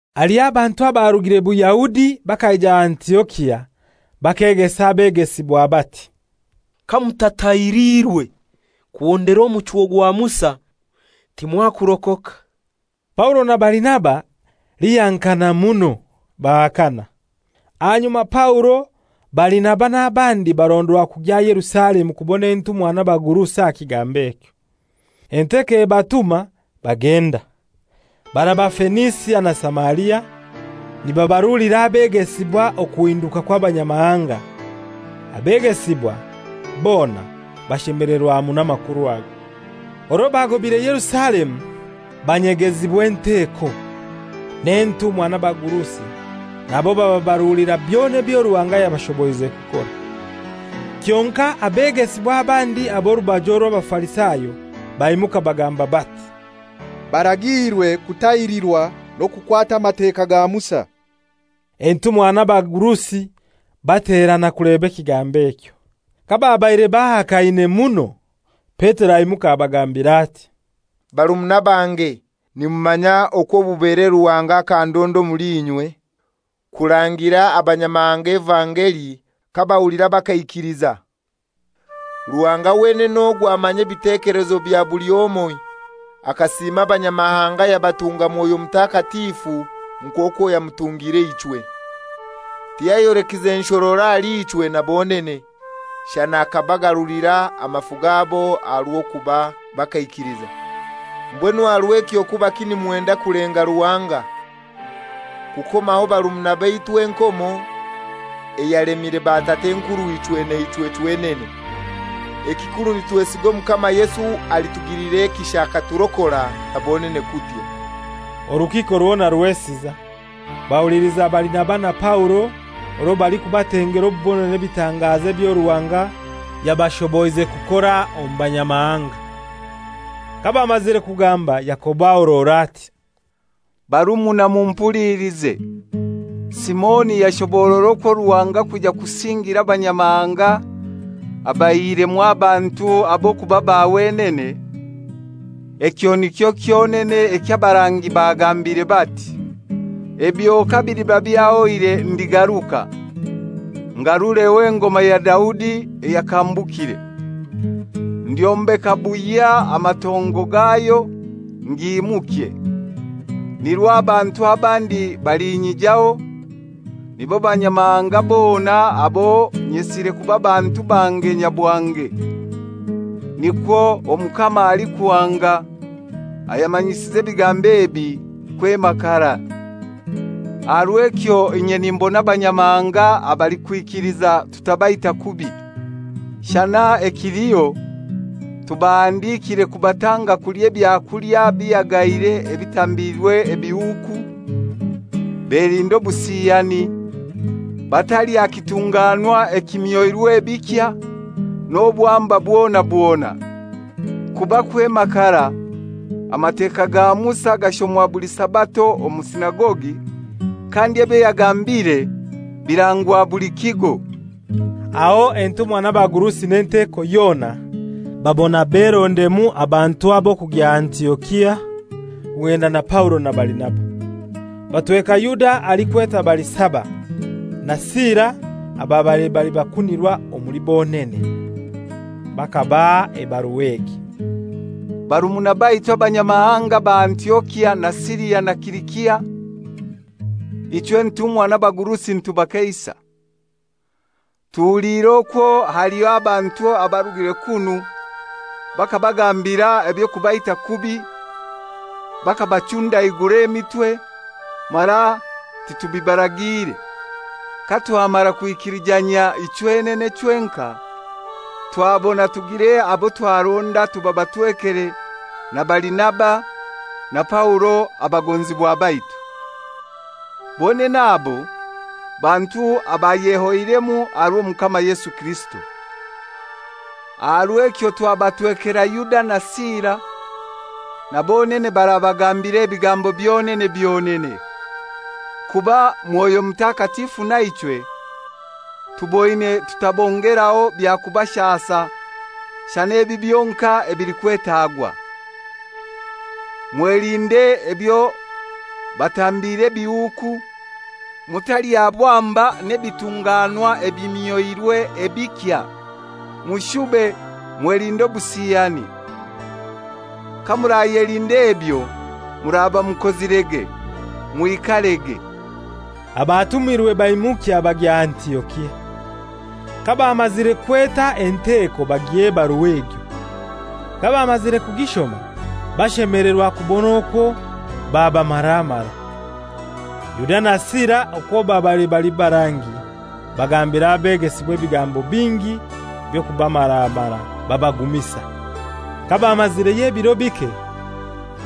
Haliho abantu abarugire Buyahudi bakaija Antiokia bakegesa abegesibwa bati, «Kamutatahiriirwe kuhondera omuchwo gwa Musa, timwakurokoka.» Paulo na Barinaba lihankana muno, bahakana. Ahanyuma Paulo, Barinaba n'abandi barondwa kugya Yerusalemu kubona entumwa n'abagurusi aha kigambo ekyo. Enteko ebatuma bagenda, baraba Fenisia na Samaria, nibabarulira abegesibwa okuhinduka kw'Abanyamahanga; abegesibwa bona bashemelerwa muno amakuru ago. Orwo baagobaire Yerusalemu banyegezibwa enteko, n'entumwa n'abagurusi, nabo bababarulira byona ebyo Ruhanga yabashoboize kukora. Kyonkai abegesibwa abandi ab'orubaju orw'Abafarisayo baimuka bagamba bati, «baragiirwe kutahirirwa n'okukwata Amateka ga Musa.» Entumwa n'abagurusi baterana kuleba ekigambo ekyo. Kababaire bahakaine muno, Petero aimuka abagambira ati, «Barumuna bange, nimumanya okwo obubere Ruhanga akandonda omuli inywe, kurangira abanyamahanga evangeli kabahulira bakaikiliza. Ruhanga wenene ogwo amanya ebitekelezo bya buli omoi, akasiima Abanyamahanga yabatunga Mwoyo Mutakatifu nk'okwo yamutungire ichwe. Tiyayolekize nshororo ahali ichwe na bonene; shana akabagarulira amafu gabo aha rw'okuba bakaikiliza. Mbwenu aha rw'ekyo kubaki nimwenda kulenga Ruhanga, kukomaho barumuna baitu enkomo eyalemire batat'enkurw'ichwe naichwe chwenene? Ekikuru nitwesiga Omukama Yesu alitugilira ekisha aturokore, na bonene kutyo.» Orukiiko rwona rwesiza. Bahuliliza Barinaba na Paulo orwo balikubatengera obubonero n'ebitangazo ebyo Ruhanga yabashoboize kukora omu Banyamahanga. Kabamazire kugamba Yakobo ahorora ati, «Barumuna, mumpulilize. Simoni yashoborora okwo Ruhanga kwija kusingira Abanyamahanga abaihiremu abantu ab'okuba ba wenene. Ekyo nikyo kyonene eky'abarangi bagambire bati, ‹Ebyo kabiliba byahoire ndigaruka, ngarureho engoma ya Daudi eyakambukire. Ndyombeka buhya amatongo gayo, ngiimukye, nirwo abantu abandi balinyijaho, nibo Banyamahanga bona abo nyesire kuba bantu bange nyabwange. Nikwo Omukama alikuhanga ayamanyisize ebigambo ebi kwema karai.› Aha rw'ekyo inye nimbona Abanyamahanga abalikwikiliza tutabaita kubi. Shana ekiliho tubahandikiire kubatanga kulya ebyakulya bihagaire ebitambiirwe ebihuuku; belinde obusiyani; batalya kitunganwa ekimyoirwe bikya, n'obwamba bwona bwona. Kuba kwema karai Amateka ga Musa gashomwa buli Sabato omu sinagogi, kandi ebyo yagambiire birangwa buli kigo.» Aho entumwa n'abagurusi n'enteko yona, babona berondemu abantu ab'okugya Antiokia, kugenda na Paulo na Barinaba. Batweka Yuda alikwetwa Barisaba, na Sila ababaire bali bakunirwa omuli bonene. Bakabaha ebarua egi: «Barumuna baitu Abanyamahanga ba Antiokia na Siria na Silisia, ichwe entumwa n'abagurusi nitubakeisa. Tuhuliire okwo haliho abantu abarugire kunu bakabagambira eby'okubaita kubi bakabachundaigura emitwe, mara titubibaragiire. Katwamara kwikilijanyia ichwenene chwenkai, twabona tugire abo twaronda tubabatwekere na Barinaba na Paulo abagonzibwa baitu. Bonene abo bantu abayehoiremu aha rw'Omukama Yesu Kirisito. Aha rw'ekyo twabatwekera Yuda na Sila, na bonene barabagambira ebigambo byonene byonene. Kuba Mwoyo Mutakatifu naichwe, tuboine tutabongeraho byakubashasa shana ebi byonkai ebilikwetagwa: Mwelinde ebyo batambiire ebihuuku, mutalya bwamba n'ebitunganwa ebimyoirwe ebikya, mushube mwelinde obusiyani. Kamurayelinda ebyo muraba mukozirege. Mwikarege.» Abatumirwe baimukya bagya Antiokia. Kabamazire kweta enteko bagiha ebarua egyo. Kabamazire kugishoma bashemelerwa kubona okwo babamaramara. Yuda na Sila okwo babaire bali barangi, bagambira abegesibwa ebigambo bingi by'okubamaramara, babagumisa. Kabamazireyo ebiro bike,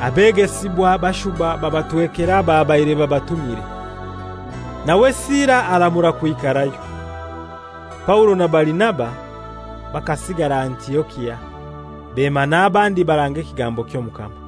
abegesibwa bashuba babatwekera ababaire babatumire. [Nawe Sila aramura kwikarayo.] Paulo na Barinaba bakasigara Antiokia, bema n'abandi baranga ekigambo ky'Omukama.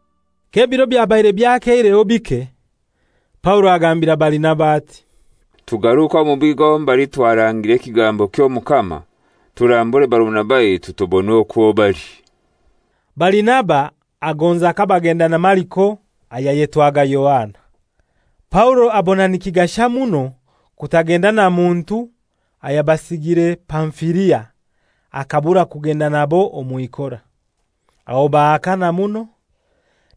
K'ebiro byabaire byakeireho bike, Paulo agambira Barinaba ati, «Tugaruke omu bigo mbali twarangire ekigambo ky'Omukama turambure barumuna baitu, tubone okwo bali.» Barinaba agonza kabagenda na Mariko ayayetwaga Yohana. Paulo abona nikigasha muno kutagenda na muntu ayabasigire Pamfilia, akabura kugenda nabo omw'ikora. Aho bahakana muno,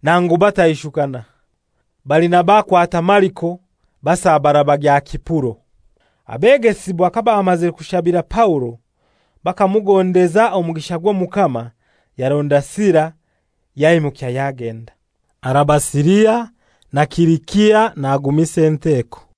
nangu bataishukana. Barinaba akwata Mariko basabara bagya Sipuro. Abegesibwa kabamazire kushabira Paulo, bakamugondeza omugisha gw'Omukama, yaronda Sila yaimukya yagenda. Araba Siria na Silisia nagumisa enteko.